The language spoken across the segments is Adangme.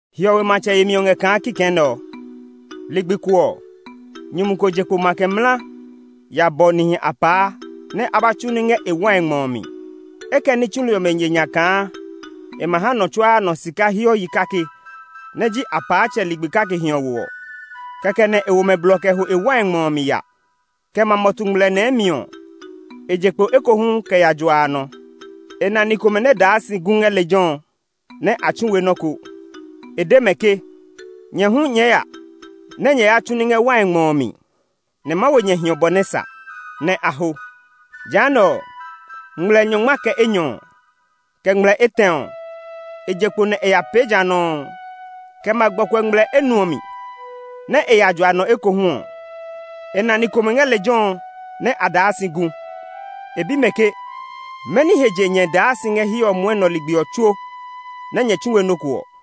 “Hiɔwe matsɛ yemi ɔ ngɛ kaa kikɛ nɛ ɔ: Ligbi ko ɔ, nyumu ko je kpo makɛ mla ya bɔ nihi apaa nɛ a ba tsu ní ngɛ e wai ngmɔ mi. E kɛ ní tsuli ɔmɛ ye nya kaa e ma ha nɔ tsuaa nɔ sika hiɔ yi kake nɛ ji apaatsɛ ligbi kake hiɔwo ɔ. Kɛkɛ nɛ e wo mɛ blɔ kɛ ho e wai ngmɔ ɔ mi ya. Kɛ ma mɔtu ngmlɛ nɛɛ mi ɔ, e je kpo ekohu kɛ ya jua a nɔ. E na ni komɛ nɛ daa si gu ngɛ lejɛ ɔ nɛ a tsu we nɔ́ ko. E de mɛ ke, ‘Nyɛ hu nyɛɛ ya nɛ nyɛ ya tsu ní ngɛ wai ngmɔ ɔ mi, nɛ ma wo nyɛ hiɔ bɔ nɛ sa.’ Nɛ a ho. Jehanɛ ɔ, ngmlɛ nyɔngma kɛ enyɔ, kɛ ngmlɛ etɛ ɔ, e je kpo nɛ e ya pee ja nɔuu. Kɛ ma gbɔkuɛ ngmlɛ enuɔ mi nɛ e ya jua a nɔ ekohu ɔ, e na ni komɛ ngɛ lejɛ ɔ nɛ a daa si gu. E bi mɛ ke, ‘Mɛni he je nyɛ daa si ngɛ hiɛ ɔ mwɔnɛ ligbi ɔ tsuo nɛ nyɛ tsu we nɔ́ ko ɔ?’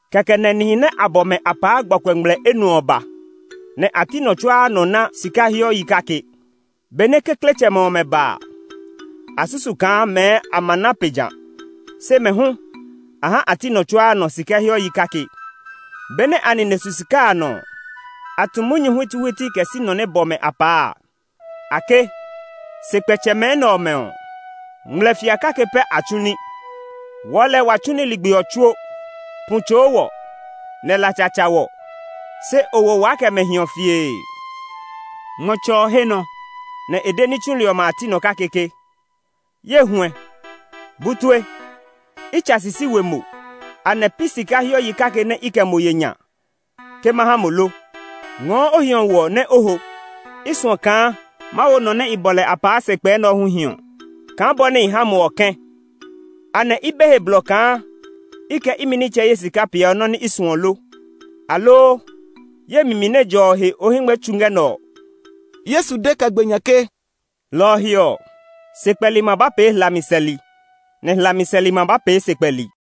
Kɛkɛ nɛ nihi nɛ a bɔ mɛ apaa gbɔkuɛ ngmlɛ enuɔ ɔ ba, nɛ a ti nɔ tsuaa nɔ na sika hiɔ yi kake. Benɛ kekletsɛmɛ ɔmɛ ba a, a susu kaa mɛɛ a ma na pe ja; se mɛ hu a ha a ti nɔ tsuaa nɔ sika hiɔ yi kake. Benɛ a nine su sika a nɔ ɔ, a tu munyu huitihuiti kɛ si nɔ nɛ bɔ mɛ apaa a. A ke, ‘Sekpɛtsɛmɛ nɛ ɔmɛ ɔ, ngmlɛfia kake pɛ a tsu ní; wɔɔ lɛɛ wa tsu ní ligbi ɔ tsuo. Pu tsoo wɔ, nɛ latsa tsa wɔ, se o wo waa kɛ mɛ hiɔ fiee!’ “Ngmɔtsɛ ɔ he nɔ nɛ e de ní tsuli ɔmɛ a ti nɔ kake ke, ‘Ye huɛ, bu tue; i tsa sisi we mo! Anɛ pi sika hiɔ yi kake nɛ i kɛ mo ye nya ke ma ha mo lo? Ngɔɔ o hiɔwo ɔ nɛ o ho. I suɔ kaa ma wo nɔ nɛ i bɔ lɛ apaa sekpɛ nɛ ɔ hu hiɔ kaa bɔ nɛ i ha mo ɔ kɛ̃. Anɛ i be he blɔ kaa i kɛ imi nitsɛ ye sika peeɔ nɔ́ nɛ i suɔ lo? Aloo ye mi mi nɛ jɔ ɔ he o hɛngmɛ tsu ngɛ nɛ ɔ?’” Yesu de kɛ gbe nya ke, “Lɔ ɔ he ɔ, sekpɛli ma ba pee hlami sɛli, nɛ hlami sɛli ma ba pee sekpɛli.”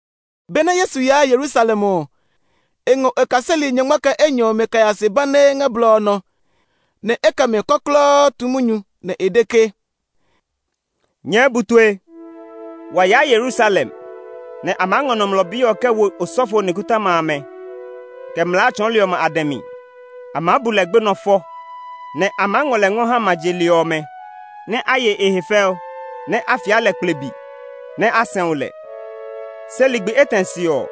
Benɛ Yesu yaa Yerusalem ɔ, e ngɔ e kaseli nyɔngma kɛ enyɔ ɔmɛ kɛ ya se banee ngɛ blɔ ɔ nɔ, nɛ e kɛ mɛ kɔklɔɔ tu munyu, nɛ e de ke, “Nyɛɛ bu tue! Wa yaa Yerusalem, nɛ a maa ngɔ Nɔmlɔ Bi ɔ kɛ wo osɔfo nikɔtɔma amɛ, kɛ mlaa tsɔɔli ɔmɛ a dɛ mi. A maa bu lɛ gbenɔ fɔ, nɛ a maa ngɔ lɛ ngɔ ha ma je li ɔmɛ nɛ a ye e he fɛu, nɛ a fia lɛ kplibi, nɛ a sɛu lɛ. Se ligbi etɛ se ɔ,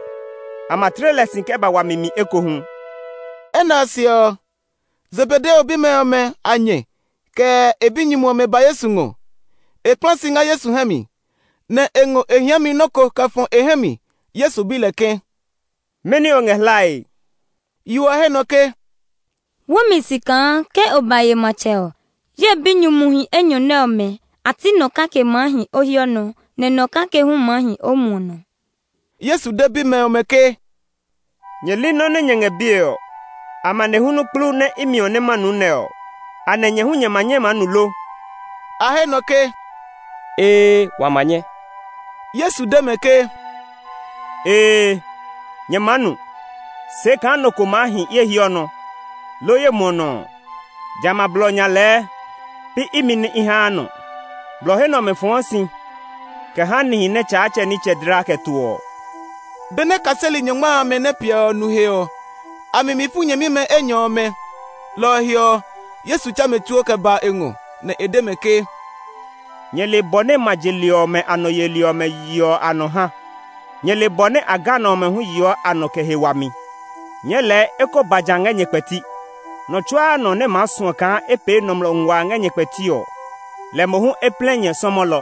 a ma tle lɛ si kɛ ba wami mi ekohu.” Enɛ ɔ se ɔ, Zebedeo bimɛ ɔmɛ a nyɛ kɛ e binyumu ɔmɛ ba Yesu ngɔ. E kpla si ngɛ Yesu hɛ mi, nɛ e ngɔ e hiami nɔ́ ko kɛ fɔ e hɛ mi. Yesu bi lɛ ke, “Mɛni o ngɛ hlae?” Yo ɔ he nɔ ke, “Wó mi si kaa ke o ba ye matsɛ ɔ, ye binyumuhi enyɔ nɛ ɔmɛ a ti nɔ kake maa hi o hiɔ nɔ, nɛ nɔ kake hu maa hi o muɔ nɔ.” Yesu de bimɛ ɔmɛ ke, “Nyɛ li nɔ́ nɛ nyɛ ngɛ bie ɔ. Amanehlu kplu nɛ i miɔ nɛ ma nu nɛ ɔ, anɛ nyɛ hu nyɛ ma nyɛ maa nu lo?” A he nɔ ke, “Ee, wa ma nyɛ!” Yesu de mɛ ke, “Ee, nyɛ maa nu. Se kaa nɔ ko maa hi ye hiɔ nɔ, loo ye muɔ nɔ ɔ, jamɛ a blɔ nya a lɛɛ pi imi nɛ i haa nɔ. Blɔ he nɛ ɔmɛ fɔɔ si kɛ ha nihi nɛ Tsaatsɛ nitsɛ dla kɛ to ɔ.” Benɛ kaseli nyɔngma amɛ nɛ piɛ ɔ nu he ɔ, a mi mi fu nyɛmimɛ enyɔ ɔmɛ. Lɔ ɔ he ɔ, Yesu tsɛ mɛ tsuo kɛ ba e ngɔ, nɛ e de mɛ ke, “Nyɛ le bɔ nɛ ma je li ɔmɛ a nɔ yeli ɔmɛ yeɔ a nɔ ha. Nyɛ le bɔ nɛ a ganɔ ɔmɛ yeɔ a nɔ kɛ he wami. Nyɛɛ lɛɛ e ko ba ja ngɛ nyɛ kpɛti; nɔ tsuaa nɔ nɛ maa suɔ kaa e pee nɔmlɔ nguaa ngɛ nyɛ kpɛti ɔ, lɛ mohu e plɛ nyɛ sɔmɔlɔ;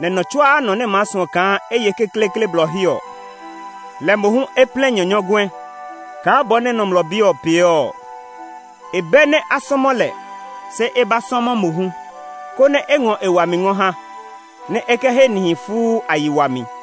nɛ nɔ tsuaa nɔ nɛ maa suɔ kaa e ye kekleekle blɔ he ɔ, lɛ mohu e plɛ nyɛ nyɔguɛ kaa bɔ nɛ Nɔmlɔ Bi ɔ pee ɔ. E bɛ nɛ a sɔmɔ lɛ, se e ba sɔmɔ mohu, konɛ e ngɔ e wami ngɔ ha, nɛ e kɛ he nihi fuu a yi wami.”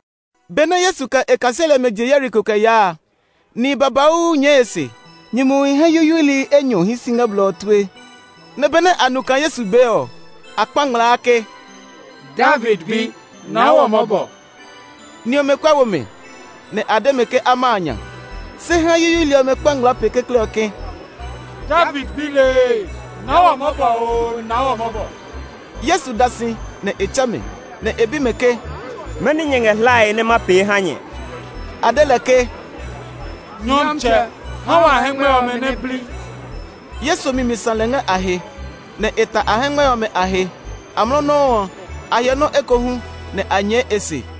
Benɛ Yesu kɛ e kaseli ɔmɛ je Yeriko kɛ yaa a, nihi babauu nyɛɛ e se. Nyumuhi hɛ yuyuili enyɔ hii si ngɛ blɔ ɔ tue, nɛ benɛ a nu kaa Yesu bee ɔ, a kpa ngmlaa ke, “David bi! Naa wɔ mɔbɔ!” Ni ɔmɛ kuɛ wo mɛ, nɛ a de mɛ ke a ma a nya. Se hɛ yuyuili ɔmɛ kpa ngmlaa pe kekle ɔ ke, “David bi lee! Naa wɔ mɔbɔ oo, naa wɔ mɔbɔ!” Yesu da si, nɛ e tsɛ mɛ, nɛ e bi mɛ ke, “Mɛni nyɛ ngɛ hlae nɛ ma pee ha nyɛ?” A de lɛ ke, “Nyɔmtsɛ, ha wa hɛngmɛ ɔmɛ nɛ bli.” Yesu mi mi sã lɛ ngɛ a he, nɛ e ta a hɛngmɛ ɔmɛ a he. Amlɔ nɔuu ɔ, a hyɛ nɔ́ ekohu, nɛ a nyɛɛ e se.